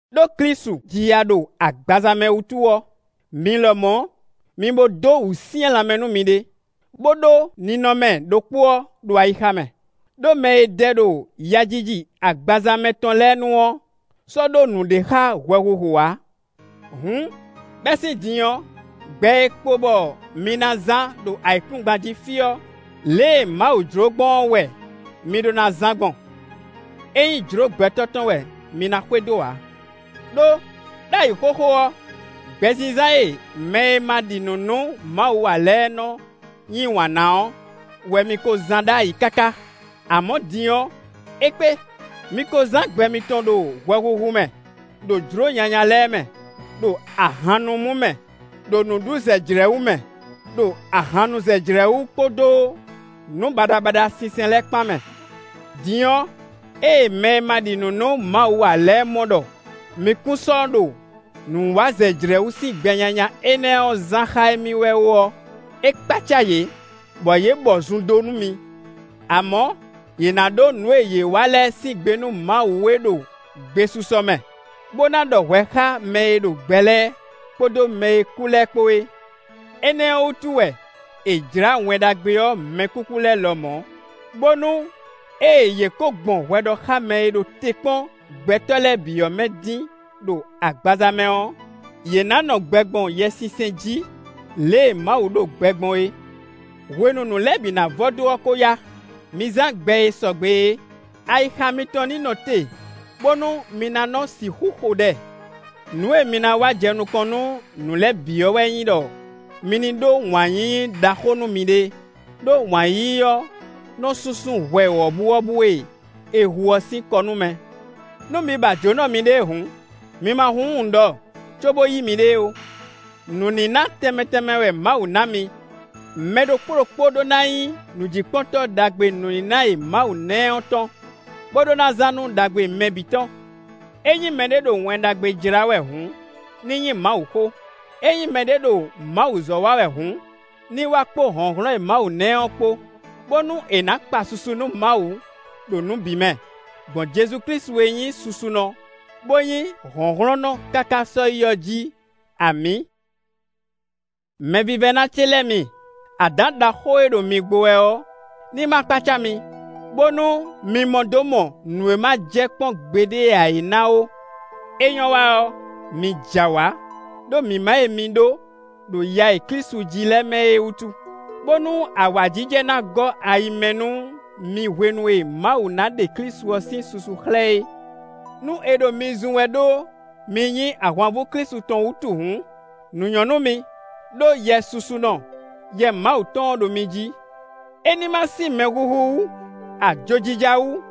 Đó Klísu ji ya ɖo agbaza mɛ wútu ɔ́, mi lɔmɔ̌ mi bo dó wǔsyɛ́n lanmɛ nú miɖée, bó ɖó ninɔmɛ ɖokpó ɔ́ ɖo ayixa mɛ; ɖó mɛ e dɛ ɖo yajiji agbaza mɛ tɔn lɛ́ɛ nu ɔ́ sɔ́ ɖó nǔɖé xá hwɛhuhu ǎ. Hǔn, bɛ́ sín din ɔ́, gbɛ e kpo bɔ mi ná zán ɖo ayǐkúngban jí fí ɔ́, lě e Mawu jló gbɔn ɔ́ wɛ mi ɖó ná zán gbɔn; é nyí jlǒ gbɛtɔ́ tɔn wɛ mi ná xwedó ǎ. Đó ɖ'ayǐ xóxó ɔ́, gbɛzínzán e mɛ e ma ɖi nǔ nú Mawu ǎ lɛ́ɛ nɔ yí wǎn na ɔ́ wɛ mi ko zán ɖ'ayǐ káká, amɔ̌ din ɔ́, é kpé. Mi ko zán gbɛ mitɔn ɖo hwɛhuhu mɛ, ɖo jlǒ nyanya lɛ́ɛ mɛ, ɖo ahannumú mɛ, ɖo nǔɖuzɛjlɛ̌wú mɛ, ɖo ahannuzɛjlɛ̌wú kpódó nǔ baɖabaɖa sinsɛn lɛ́ɛ kpán mɛ. Din ɔ́, ée mɛ ma ɖi nǔ nú Mawu ǎ lɛ́ɛ mɔ ɖɔ mi kún sɔ́ nɔ ɖo nǔwazɛjlɛ̌wú sín gbɛ nyanya énɛ́ ɔ́ zán xá émí wɛ ó ɔ́, é kpácá yě, bɔ yě bɔ zun ɖó nú mi. Amɔ̌, yě ná ɖó nǔ e yě wa lɛ́ɛ sín gbe nú Mawu e ɖo gbesisɔ mɛ, bó ná ɖɔ hwɛ xá mɛ e ɖo gbɛ lɛ́ɛ kpódó mɛ e kú lɛ́ɛ kpó é. Énɛ́ ɔ́ wútu wɛ è jlǎ Wɛn Ɖagbe ɔ́ mɛkúkú lɛ́ɛ lɔmɔ̌; bónú ée yě ko gbɔn hwɛɖɔxámɛ e ɖo te kpɔ́n gbɛtɔ́ lɛ́ɛ bǐ ɔ́ mɛ dín ɖo agbaza mɛ ɔ́, yě ná nɔ gbɛ gbɔn Yɛsinsɛn jí lě e Mawu ɖo gbɛ gbɔn é. Hwenu nǔ lɛ́ɛ bǐ ná vɔ dó ɔ́ ko yá; mi zán gbɛ e sɔgbe é; ayixa mitɔn ní nɔ te bónú mi ná nɔ sixú xo ɖɛ. Nǔ e mi ná wa jɛ nukɔn nú nǔ lɛ́ɛ bǐ ɔ́ wɛ nyí ɖɔ mi ní ɖó wǎn yíyí ɖaxó nú miɖée; ɖó wǎn yíyí ɔ́ nɔ súnsún hwɛ wɔ̌buwɔ́bú e è hu ɔ́ sín kɔ nú mɛ. Nú mi ba jǒnɔ miɖée hǔn, mi ma húnhún nǔ ɖɔ cóbó yí miɖée ó. Nǔníná tɛnmɛ tɛnmɛ wɛ Mawu ná mi. Mɛ ɖokpó ɖokpó ɖó ná nyí nǔjíkpɔ́ntɔ́ ɖagbe nǔníná e Mawu ná ɛ tɔn, bó ɖó ná zán nú ɖagbe mɛ bǐ tɔn. Ényí mɛɖé ɖo Wɛn Ɖagbe jlá wɛ hǔn, ní nyí Mawuxó; ényí mɛɖé ɖo Mawuzɔ́ wa wɛ hǔn, ní wa kpó hlɔ̌nhlɔ́n e Mawu ná ɛ ɔ́ kpó, bónú è nǎ kpa susu nú Mawu ɖo nǔ bǐ mɛ, gbɔn Jezu Klísu e nyí susunɔ, bó nyí hlɔ̌nhlɔ́nnɔ káká sɔ́yi ɔ́ jí! Amǐ! Mɛvívɛ́ná ce lɛ́ɛ mi, adǎn ɖaxó e ɖo mi gbo wɛ ɔ́ ní ma kpácá mi, bónú mi mɔ dó mɔ nǔ e ma jɛ kpɔ́n gbeɖé ǎ é ná ó. É nyɔ́ wa ɔ́, mi jɛ awǎ ɖó mǐmá e mi ɖó ɖo ya e Klísu jí lɛ́ɛ mɛ é wútu, bónú awǎjijɛ ná gɔ́ ayi mɛ nú mi hwenu e Mawu ná ɖe Klísu ɔ́ sín susu xlɛ́ é. Nú è ɖo mi zun wɛ ɖó mi nyí ahwanvú Klísu tɔn wútu hǔn, nǔ nyɔ́ nú mi, ɖó Yɛ susunɔ, Yɛ Mawu tɔn ɔ́ ɖo mi jí. É ní ma sín mɛhuhu wú, ajojija wú,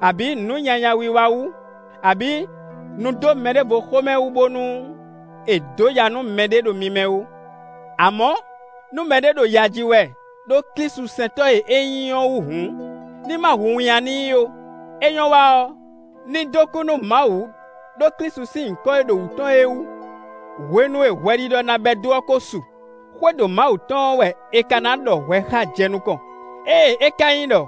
abǐ nǔ nyanya wiwa wú, abǐ nudómɛɖévoxómɛ wú bónú è dǒ ya nú mɛɖé ɖo mi mɛ ó. Amɔ̌, nú mɛɖé ɖo ya ji wɛ ɖó klísusɛntɔ́ e é nyí ɔ́ wú hǔn, ní ma hu winnyá n'i ó; é nyɔ́ wa ɔ́, ní dó kú nú Mawu ɖó Klísu sín nyǐkɔ e ɖo wú tɔn é wú. Hwenu e hwɛɖiɖɔ ná bɛ́ dó ɔ́ ko su; xwédo Mawu tɔn ɔ́ wɛ è ka ná ɖɔ hwɛ xá jɛ nukɔn. Ée é ka nyí ɖɔ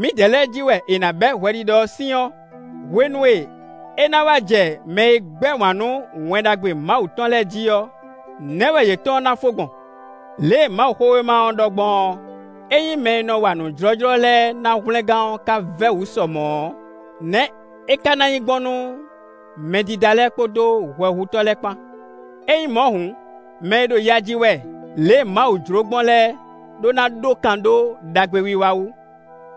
mǐdɛɛ lɛ́ɛ jí wɛ è nǎ bɛ́ hwɛɖiɖɔ sín ɔ́, hwenu e é ná wá jɛ mɛ e gbɛ́ wǎn nú Wɛn Ɖagbe Mawu tɔn lɛ́ɛ jí ɔ́, nɛ̌ wɛ yětɔn ná fó gbɔn? Lě e Mawuxówéma ɔ́ ɖɔ gbɔn ɔ́: “Ényí mɛ e nɔ wa nǔ jlɔ́jlɔ́ lɛ́ɛ ná hwlɛngán ɔ́ ka vɛ́ wǔ sɔ mɔ̌ ɔ́, nɛ̌ é ka ná nyí gbɔn nú mɛdídá lɛ́ɛ kpódó hwɛhutɔ́ lɛ́ɛ kpán?” Ényí mɔ̌ hǔn, mɛ e ɖo ya ji wɛ lě e Mawu jló gbɔn lɛ́ɛ ɖó ná ɖó kan dó ɖagbewiwa wú,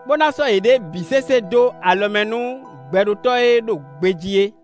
bó ná sɔ́ yěɖée bǐ sésé dó alɔ mɛ nú Gbɛɖótɔ́ e ɖo gbejí é.